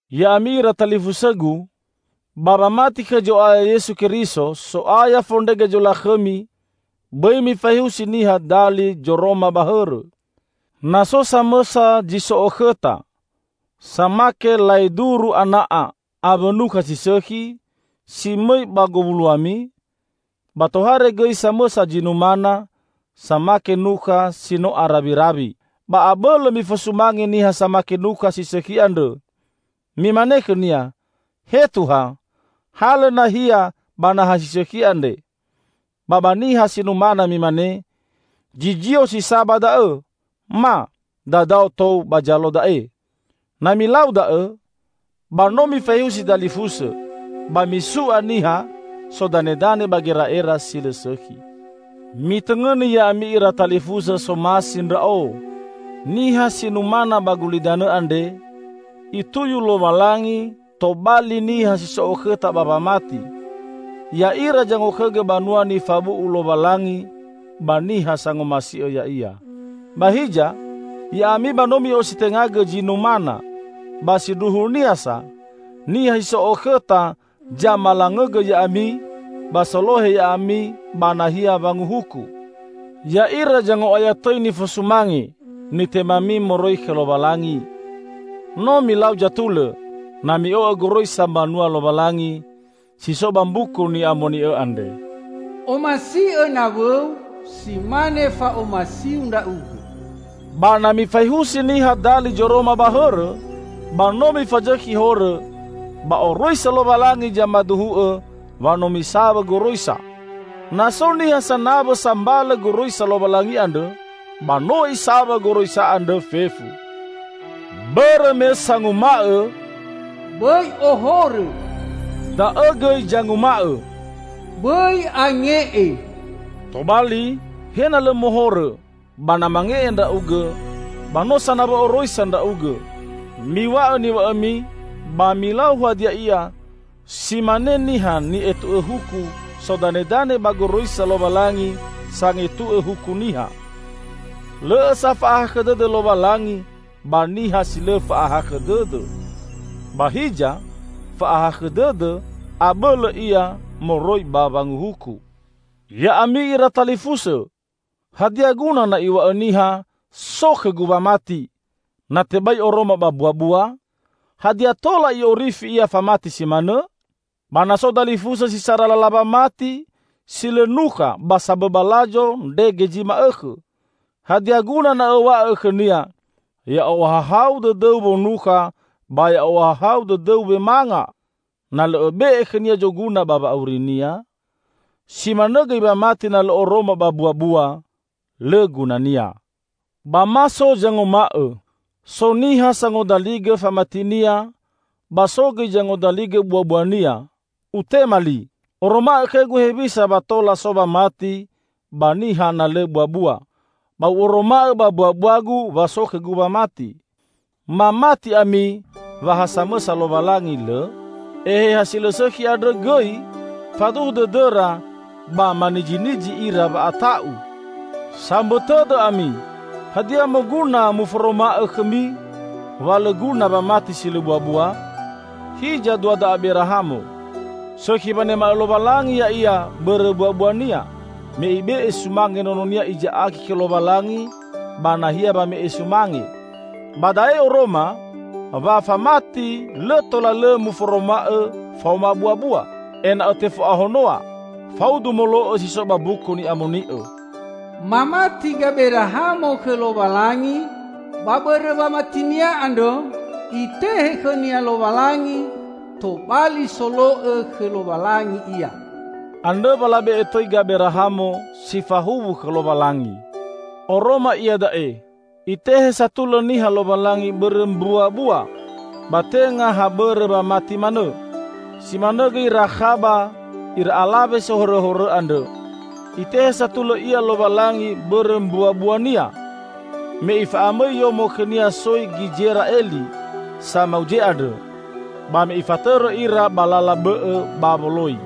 Ya'ami ira talifusõgu! Ba wamati khõ Zoaya Yesu Keriso, So'aya fondrege zolakhõmi, bõi mifaehusi niha dali zoroma ba hõrõ. Na so samõsa zi so okhõta, samake laeduru ana'a awõ nukha si sõkhi, si mõi ba gowuloami, ba tohare gõi samõsa zi numana, samake nukha si no arawirawi, ba abõlõ mifosumange niha samake nukha si sõkhi andrõ. Mimane khõnia: "He Tuha, halõ nahia ba naha si sõkhi andre." Ba ba niha si numana mimane: "Zizio si sa ba da'õ," ma "Dadao tou ba zalo da'e." Na milau da'õ, ba no mifaehusi dalifusõ, ba misu'a niha sodanedane ba gera'era si lõ sõkhi. Mitõngõni ya'ami ira talifusõ, somasi ndra'o! Niha si numana ba gulidanõ andre, Ituyu Lowalangi tobali niha si so okhõta ba wamati. Ya'ira zangokhõgõ banua nifabu'u Lowalangi ba niha sangomasi'õ Ya'ia. Ba hiza, ya'ami ba no mi'ositengagõ zi numana, ba sindruhunia sa, niha si so okhõta zamalangõgõ ya'ami ba solohe ya'ami ba nahia wanguhuku. Ya'ira zango'aya tõi nifosumange, nitemami moroi khõ Lowalangi No milau zatulõ, na mi'o'õ goroisa mbanua Lowalangi, si so ba Mbuku Ni'amoni'õ andre, "Omasi'õ nawõu si mane fa'omasiu ndra'ugõ." Ba na mifaehusi niha dali zoroma ba hõrõ, ba no mifazõkhi horõ, ba oroisa Lowalangi zamaduhu'õ wa no misawõ goroisa. Na so niha sanawõ sambalõ goroisa Lowalangi andrõ, ba no isawõ goroisa andrõ fefu. Bõrõ me sanguma'õ: "Bõi ohorõ", da'õ gõi zanguma'õ: "Bõi ange'e". Tobali he na lõ mohorõ, ba na mange'e ndra'ugõ, ba no sanawõ oroisa ndra'ugõ. Miw̃a'õ niw̃a'õmi ba milau hadia ia, si mane niha ni'etu'õ huku sodanedane ba goroisa Lowalangi sangetu'õ huku niha. Lõ'õ sa fa'ahakhõ dõdõ Lowalangi ba niha si lõ fa'ahakhõ dõdõ. Ba hiza, fa'ahakhõ dõdõ abõlõ ia moroi ba wanguhuku. Ya'ami ira talifusõ! Hadia guna na iw̃a'õ niha, "So khõgu wamati," na tebai oroma ba mbuabua? Hadia tola i'orifi ia famati si manõ? Ba na so dalifusõ si sara lala wamati si lõ nukha ba sambõ balazo ndrege zi ma'õkhõ, hadia guna na õw̃a'õ khõnia: "Ya'ohahau dõdõu wonukha ba ya'ohahau dõdõu wemanga!" -- na lõ õbe'e khõnia zoguna ba wa'aurinia? Si manõ gõi wamati na lõ oroma ba mbuabua, lõ gunania. Ba ma so zanguma'õ: "So niha sangodaligõ famatinia ba so gõi zangodaligõ buabuania", utema li: "Oroma'õ khõgu hewisa wa tola so wamati ba niha na lõ buabua, ba u'oroma'õ ba mbuabuagu wa so khõgu wamati." Mamati ami wa ha samõsa Lowalangi, lõ? Eheha si lõ sõkhi andrõ gõi faduhu dõdõra ba manizinizi ira wa'ata'u! Sambõ tõdõ ami! Hadia moguna muforoma'õ khõmi wa lõ guna wamati si lõ buabua? Hiza duada Aberahamo. Sõkhi wanema'õ Lowalangi ya'ia bõrõ mbuabuania, me ibe'e sumange nononia Iza'aki khõ Lowalangi ba nahia wame sumange. Ba da'e oroma, wa famati lõ tola lõ muforoma'õ faoma buabua, ena'õ tefo'ahonoa. Faudu molo'õ si so ba Mbuku Ni'amoni'õ: "Mamati Gaberahamo khõ Lowalangi, ba bõrõ wamatinia andrõ, Itehe khõnia Lowalangi tobali solo'õ khõ Lowalangi ia." Andrõ wa labe'e tõi Gaberahamo: "Si fahuwu khõ Lowalangi". Oroma iada'e, Itehe satulõ niha Lowalangi bõrõ mbuabua, ba tenga ha bõrõ wamati manõ. Si manõ gõi Rakhaba, ira alawe sohorõhorõ andrõ. Itehe satulõ ia Lowalangi bõrõ mbuabuania, me ifa'amõi yomo khõnia soi Gizera'eli samauze andrõ, ba me ifatõrõ ira ba lala bõ'õ ba woloi.